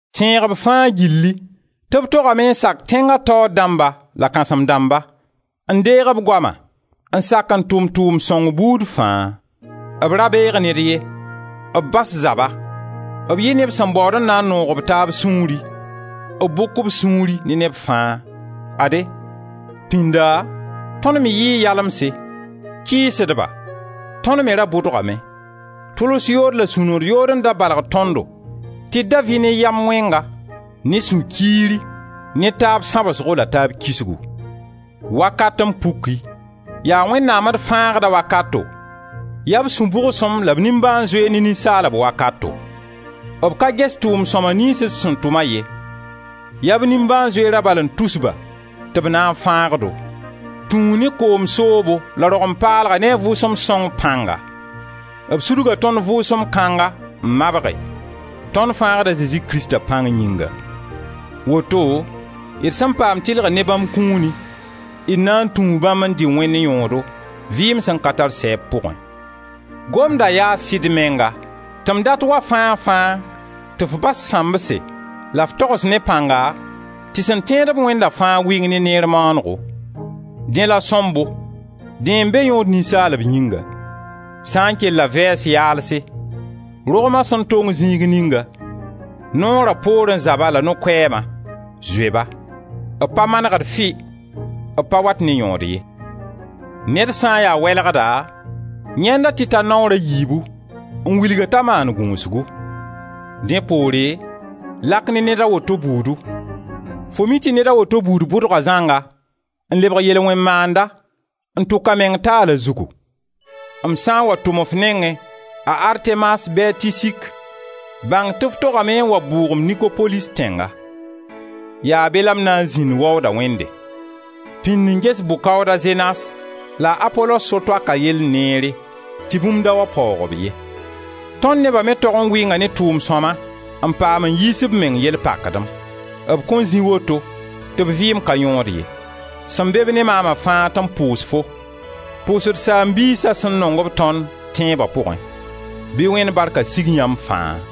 Tẽeg b fãa gilli tɩ b togame n sak tẽnga taoor dãmba la kãsem-dãmba, n deeg b goama, n sak n tʋm tʋʋmd sõng buud fãa. B ra beeg ned ye, b bas zaba, b yɩ neb sẽn baood n na n noog b taab sũuri, b bʋk b sũuri ne neb fãa. Ade, pĩnda tõnd me yɩɩ yalemse, kɩɩsdba; tõnd me ra bʋdgame; tʋls yood la sũ-nood yood n da balg tõndo tɩ d da vɩ ne yam wẽnga, ne sũ-kiiri, ne taab sãbsgo la taab kisgu. Wakat n puki, yaa Wẽnnaam d Fãagda wakato, yaa b sũ-bʋgsem la b nimbãan-zoeer ne ninsaalb wakato. B ka ges tʋʋm-sõma niyns d sẽn tʋma ye, yaa b nimbãan-zoeera bal n tus ba tɩ b na n fãag-do. Tũu ne koom soobo la rogem paalga ne a Vʋʋsem Sõngo pãnga. B sudga tõnd Vʋʋsem kãnga n mabge, tõnd Fãagd a Zezi Krista pãng yĩnga. Woto d sen paam tɩlgr ne bãmb kũuni, d na n tũu bãmb n dɩ Wẽnd yõodo, vɩɩm sẽn ka tar sɛɛb pʋgẽ. Gomda yaa sɩd menga tɩ m dat wa fãa-fãa tɩ f bas sãmbse la f togs ne pãnga tɩ sẽn tẽed-b Wẽnda fãa wɩng ne neer maanego. Dẽ la sõmbo, dẽ n be yõod ninsaalb yĩnga. Sã n kella vɛɛs yaalse, rogma sẽn tong zĩig ninga, Noora poorẽ zaba la no-koɛɛma, zoe-ba. B pa manegd fɩ, b pa wat ne yõod ye. Ned sã n ya welgda, yãend-a tɩ ta naoor a yiibu, n wilg-a t'a maan gũusgu; dẽ poore lak ne ned a woto buudu. Fo mi tɩ ned a woto buud bʋdga zãnga, n lebg yel-wẽn-maanda, n tʋk a meng taal a zugu. M sã n wa tʋm f nengẽ a Artemas bɩ a Tisik, bãng tɩ f togame n wa bʋʋg-m Nikopolis tẽnga: yaa be la m na n zĩnd waooda wẽnde. Pĩnd n ges bʋ-kaooda Zenas la a Apolos so-toaka yell neere, tɩ bũmb da wa paoog-b ye. Tõnd neba me tog n wɩnga ne tʋʋm-sõma n paam n yiis b meng yell pakdem; b kõn zĩ woto tɩ b vɩɩm ka yõod ye. Sẽn be-b ne maama fãa tɩ b pʋʋs-fo. Pʋʋs d saam-biisa sẽn nong-b tõnd, tẽeba pʋgẽ. Bɩ Wẽnd barka sig yãmb fãa!